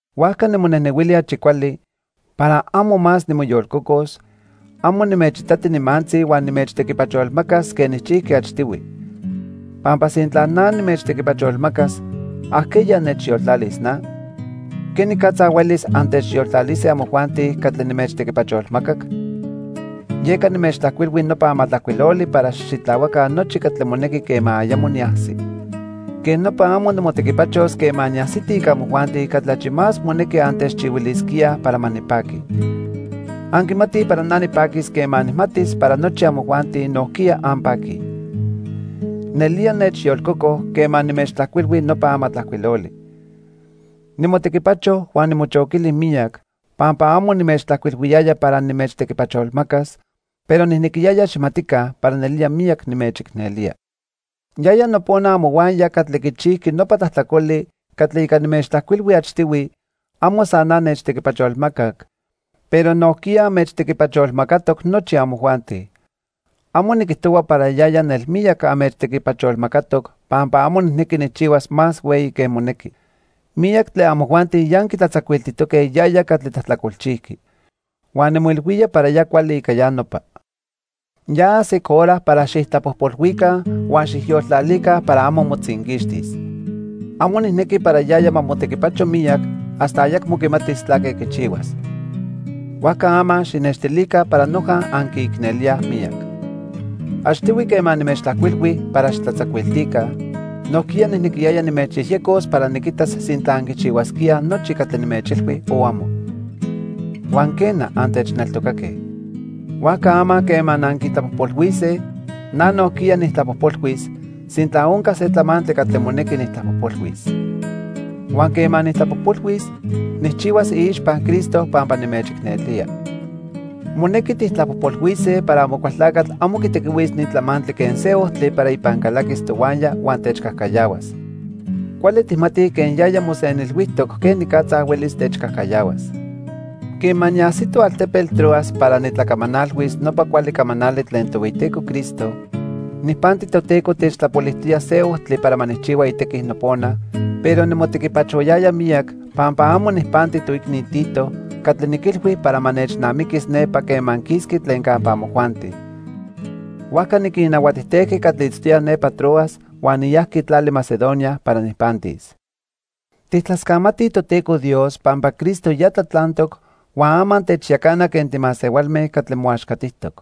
Huajca nimonejnehuili achi cuali, para amo más nimoyolcocos, amo nimechitati nimantzi huan nimechtequipacholmacas quen nijchijqui achtihui. Pampa sintla na nimechtequipacholmacas, ¿ajqueya nechyoltlalis na? ¿Quenicatza huelis antechyoltlalise amojuanti catli nimechtequipacholmacac? Yeca nimechtlajcuilhui nopa amatlajcuiloli para xijxitlahuaca nochi catli monequi quema ayamo niajsi. Quej nopa amo nimotequipachos quema niajsiti ica amojuanti catli achi más monequi antechchihuilisquíaj para ma nipaqui. Anquimatij para na nipaquis quema nijmatis para nochi amojuanti nojquiya anpaquij. Nelía nechyolcoco quema nimechtlajcuilhui nopa amatlajcuiloli. Nimotequipacho huan nimochoquili miyac, pampa amo nimechtlajcuilhuiyaya para nimechtequipacholmacas, pero nijnequiyaya xijmatica para nelía miyac nimechicnelía. Yaya nopona amohuaya catli quichijqui nopa tlajtlacoli catli ica nimechtlajcuilhui achtihui, amo san na nechtequipacholmacac, pero nojquiya anmechtequipacholmacatoc nochi amojuanti. Amo niquijtohua para yaya nelmiyac anmechtequipacholmacatoc pampa amo nijnequi nijchihuas más hueyi que monequi. Miyac tlen amojuanti ya anquitlatzacuiltijtoque yaya catli tlajtlacolchijqui. Huan nimoilhuía para ya cuali ica ya nopa. Ya ajsic hora para xijtlapojpolhuica huan xijyoltlalica para amo motzinquixtis. Amo nijnequi para yaya ma motequipacho miyac hasta ayacmo quimatis tlaque quichihuas. Huajca ama xijnextilica para noja anquiicnelíaj miyac. Achtihui quema nimechtlajcuilhui para xijtlatzacuiltica, nojquiya nijnequiyaya nimechyejyecos para niquitas sintla anquichihuasquíaj nochi catli nimechilhui o amo. Huan, quena, antechneltocaque. Huajca ama quema anquitlapojpolhuise, na nojquiya nijtlapojpolhuis, sintla onca se tlamantli catli monequi nijtlapojpolhuis. Huan quema nijtlapojpolhuis, nijchihuas iixpa Cristo pampa nimechicnelía. Monequi tijtlapojpolhuise para Amocualtlacatl amo quitequihuis ni tlamantli quen se ojtli para ipan calaquis tohuaya huan techcajcayahuas. Cuali tijmatij quen yaya mosenilhuijtoc quenicatza huelis techcajcayahuas. Quema niajsito altepetl Troas para nitlacamanalhuis nopa cuali camanali tlen Tohueyiteco Cristo, nijpanti Toteco techtlapolijtoya se ojtli para ma nijchihua itequi nopona, pero nimotequipachoyaya miyac pampa amo nijpanti toicni Tito catli niquilhui para ma nechnamiquis nepa quema quisqui tlen campa amojuanti. Huajca niquinnahuatijtejqui catli itztoyaj nepa Troas huan niyajqui tlali Macedonia para nijpantis. Tijtlascamatij Toteco Dios pampa Cristo ya tlatlantoc huan ama techyacana quen timasehualme catli moaxcatijtoc.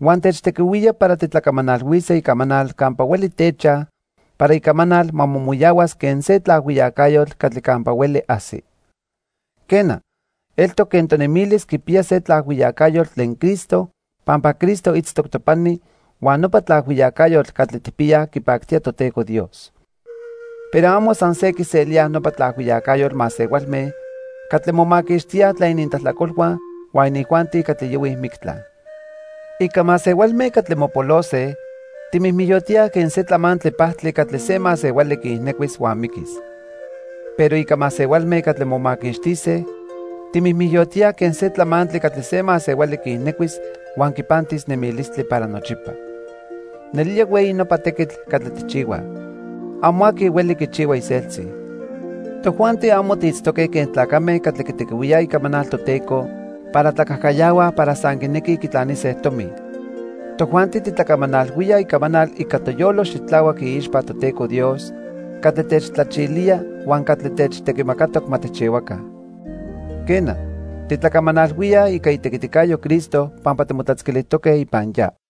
Huan techtequihuía para titlacamanalhuise icamanal campa hueli techaj para icamanal ma momoyahuas quen se tlaajhuiyacayotl catli campa hueli ajsi. Quena, eltoc quen tonemilis quipiya se tlaajhuiyacayotl tlen Cristo pampa Cristo itztoc topani huan nopa tlaajhuiyacayotl catli tijpiyaj quipactía Toteco Dios. Pero amo san se quiselíaj nopa tlaajhuiyacayotl masehualme catli momaquixtíaj tlen inintlajtlacolhua huan inijuanti catli yohuij mictla. Ica masehualme catli mopolose, timijmijyotíaj quen se tlamantli pajtli catli se masehuali quiijnecuis huan miquis. Pero ica masehualme catli momaquixtise, timijmijyotíaj quen se tlamantli catli se masehuali quiijnecuis huan quipantis nemilistli para nochipa. Nelía hueyi nopa tequitl catli tijchihuaj. Amo aqui hueli quichihua iseltzi. Tojuanti amo tiitztoque quen tlacame catli quitequihuíaj icamanal Toteco para tlacajcayahuaj para san quinequij quitlanise tomi. Tojuanti titlacamanalhuíaj icamanal ica toyolo xitlahuac iixpa Toteco Dios catli techtlachilía huan catli techtequimacatoc ma tijchihuaca. Quena, titlacamanalhuía ica itequiticayo Cristo pampa timotlatzquilijtoque ipan ya.